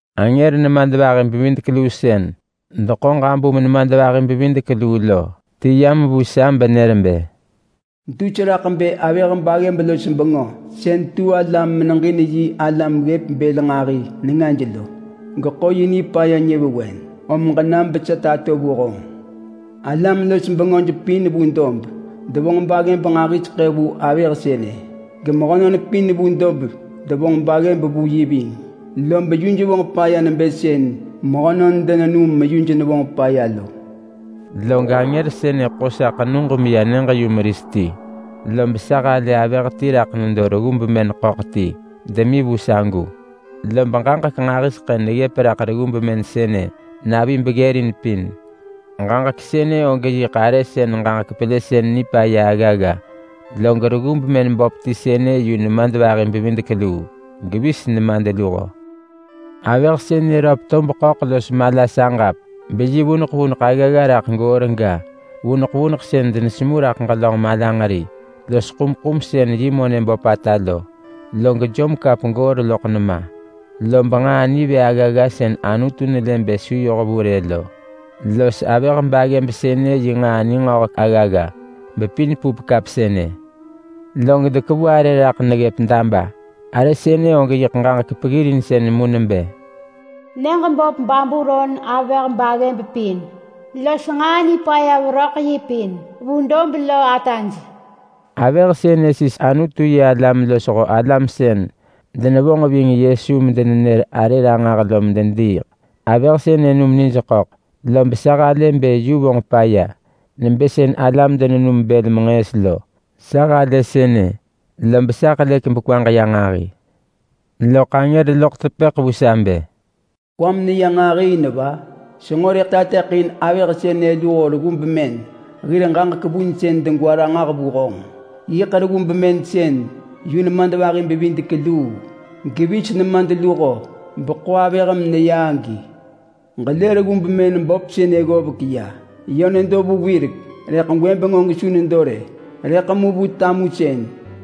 Angër nemadvahi-bevidek-luu sën deḳo ġabum nemadvahi-bevidek-luu lo ti yam vu sa benër bë, “Dus raḳ bë avëh baggëb los bengö sën tu ala meneġin yi alam ggëp bël nġahi nengaj lo geḳo yi nipaya nyëvewen. Om ġenam besa tato vu honġ. Alam-los-bengöj pin vu dob devonġ baggëb nġahiseḳë vu avëh sënë. Gemehönon pin vu dob devonġ baggëb vu yi ving, lob yuj vonġ paya nebë sën mehönon denenum meyuj nevonġ paya lo.” Log angër sënë ḳo sa ḳenug meya nyëġ-yumeris ti. Lob sa halë avëh ti raḳ nedo reggu bemën ḳöḳ ti demi vu sagu. Lob ġaġek nġahiseḳë neggëp raḳ reggu bemën sënë navi beggërin pin. Ġaġek sënë og yiḳ arë sën ġaġek pelësën nipaya aggagga. Log reggu bemën böp ti sënë yu nemadvahi-bevidek-luu, gevis nemadluho. Avëh sënë röp tob ḳöḳ los mala saġap beyi vuneḳ vuneḳ aggagga raḳ goor ga, vuneḳ vuneḳ sën denesemu raḳ ġelönġ malanġeri los ḳumḳum sën yi monë böpata lo. Log jom kap goor loḳ nema. Lob nġaa nivë aggagga sën Anutu nelë bë su yoh vu rë lo, los avëh baggëb sënë yi nġaa ningöhek aggagga, bepin pup kap sënë. Log dekevu arë raḳ neggëp daba. Arë sënë og yiḳ ġaġek peggirinsën mu nebë: NYËĠ BÖP BABULON AVËH BAGGËB PIN LOS NĠAA NIPAYA VERÖ Ḳ YI PIN VU DOB LO ATAJ. Avëh sënë sis Anutu-yi-alam losho alam sën denevonġ ving Yesu medenenër arë ranġah lo medediiḳ. Avëh sënë num nijḳöḳ lob sa halë bë yu vonġ paya nebë sën alam denenum bël menġëës lo. Sa halë sënë, lob sa helëk bekwaġ ya nġahi. Loḳ angër loḳ tepëḳ vu sa bë, “Kwam neya nġahi in va? Senġo rëḳ tateḳin avëh sënë luho reggu bemën hir ġaġek vunsën degwa ranġah vu honġ. Yiḳ reggu bemën sën yu nemadvahi-bevidek-luu, gevis nemadluho, beḳo avëh meneya agi. Ġelë reggu bemën böp sënë ggovek ya. Yö nedo vu wirek, rëḳ gwëbeng og su nedo rë. Rëḳ mu vu tamusën,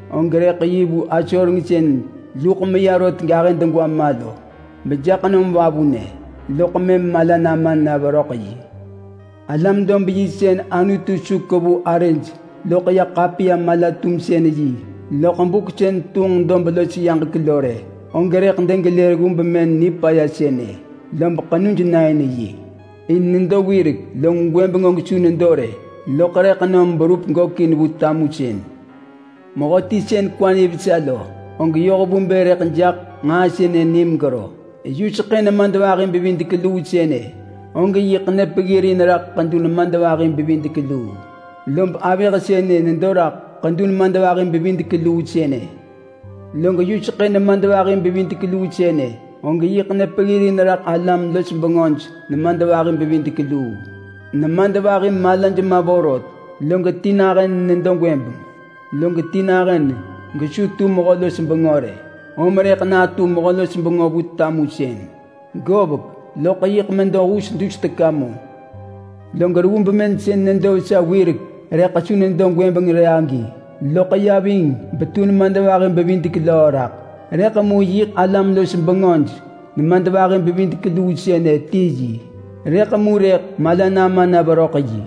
og rëḳ yi vu asoreng sën luḳ meya rot gahë degwa ma lo bejaḳ nom vavunë, loḳ mëm mala nama na veröḳ yi. Alam dob yi sën Anutu su kevu arëj loḳ ya ḳapiya-mala-tumsën-yi loḳ buk sën tunġ dob los yaġek lo rë, og rëḳ degelë reggu bemën nipaya sënë, lob ḳenuj na in yi. In nedo wirek, log gwëbeng og su nedo rë, loḳ rëḳ nom berup gökin vu tamusën. Mehöti sën kwa nivesa lo, og yoh vu bë rëḳ jaḳ nġaa sënë ni megero. Yuseḳë nemadvahi-bevidek-luu sënë og yiḳ nepeggirin raḳ ḳedu nemadvahi-bevidek-luu, lob avëh sënë nedo raḳ ḳedu nemadvahi-bevidek-luu sënë. Log yuseḳë nemadvahi-bevidek-luu sënë og yiḳ nepeggirin raḳ alam-los-bengöj nemadvahi-bevidek-luu. Nemadvahi malaj ma vorot, log ti nahën nedo gwëbeng, log ti nahën gesu tu mehö-los-bengö rë. Om rëḳ natu mehö-los-bengö vu tamusën. Govek, loḳ yiḳ medo hus dus teka mu. Log reggu bemën sën nedo vesa wirek rëḳ su nedo gwëbeng rë agi, loḳ ya ving betu nemadvahi bevidek löö raḳ. Rëḳ mu yiḳ alam-los-bengöj nemadvahi-bevidek-luu sënë ti yi, rëḳ mu rëḳ mala nama na veröḳ yi.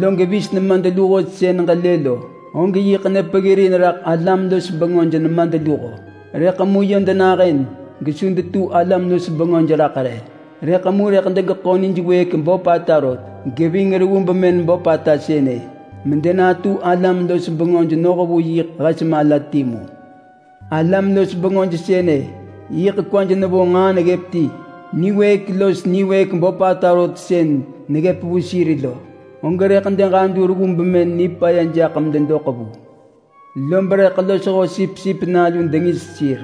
Log vis nemadluho sën ġelë lo, og yiḳ nepeggirin raḳ alam-los-bengöj nemadluho. Rëḳ mu yö denahën gesu detu alam-los-bengöj raḳ rë. Rëḳ mu rëḳ degeḳo nij wëëk böpata rot geving reggu bemën böpata sënë, medenatu alam-los-bengöj noh vu yiḳ hes mala timu. Alam-los-bengöj sënë yiḳ kwaj nevo nġaa neggëp ti. Niwëëk los niwëëk böpata rot sën neggëp vu sir lo, og rëḳ deġadu reggu bemën nipaya jaḳ mededoḳ vu. Lob rëḳ losho Sipsip Nalu dengis sir,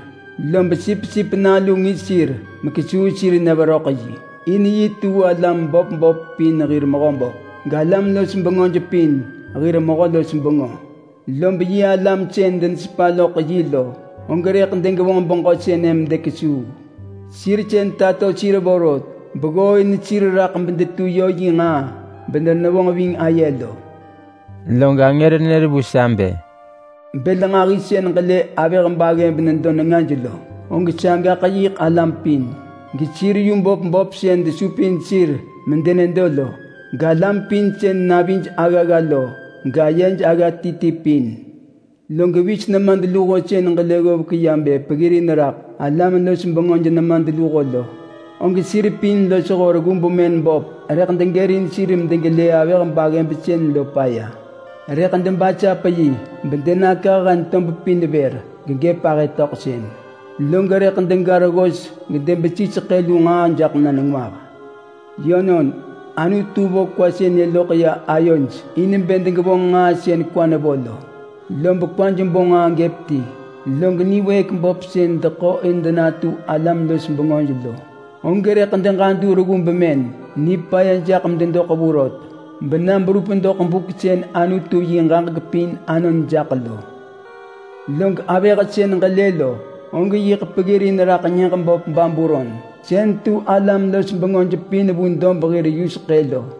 lob Sipsip Nalu ngis sir mekesuu sir na veröḳ yi. In yi tu alam böp böp pin hir Mehöböp, galam-los-bengöj pin hir Mehö-los-bengö. Lob yi alam sën denesepa loḳ yi lo, og rëḳ degevonġ beġö sënë medekesuu. Sir sën tato sir vorot beggooin sir raḳ bedetu yö yi nġaa bedenevonġ ving aye lo.” Log angër nër vu sa bë, “Bël nġahi sën ġelë avëh baggëb nedo nengaj lo, og sagaḳ yiḳ alam pin, gesir yu böp böp sën desupin sir medenedo lo, galam pin sën navij aggagga lo, gayej agga ti ti pin. Log vis nemadluho sën gelë ggovek ya bë peggirin raḳ alam-los-bengöj nemadluho lo, og sir pin losho reggu bemën böp rëḳ degërin sir medegelë avëh baggëb sën lo paya. Rëḳ debasap yi bedenakah hen tob pin vër gegëp ahë töḳsën. Log rëḳ dega reggos gedebesi seḳë lu nġaa jaḳ na nengwah. Yönon, Anutu vo kwa sënë loḳ ya ayoj in bë degevonġ nġaa sën kwa nevo lo. Lob kwaj bo nġaa gëp ti. Log niwëëk böp sën deḳo in denatu alam-los-bengöj lo, og rëḳ deġadu reggu bemën nipaya jaḳ mededoḳ vu rot, bena berup doḳ buk sën Anutu yi ġaġek pin anon jaḳ lo. Log avëh sën ġelë lo, og yiḳ peggirin raḳ nyëġ böp Babulon sën tu alam-los-bengöj pin vu dob hir yuseḳë lo.”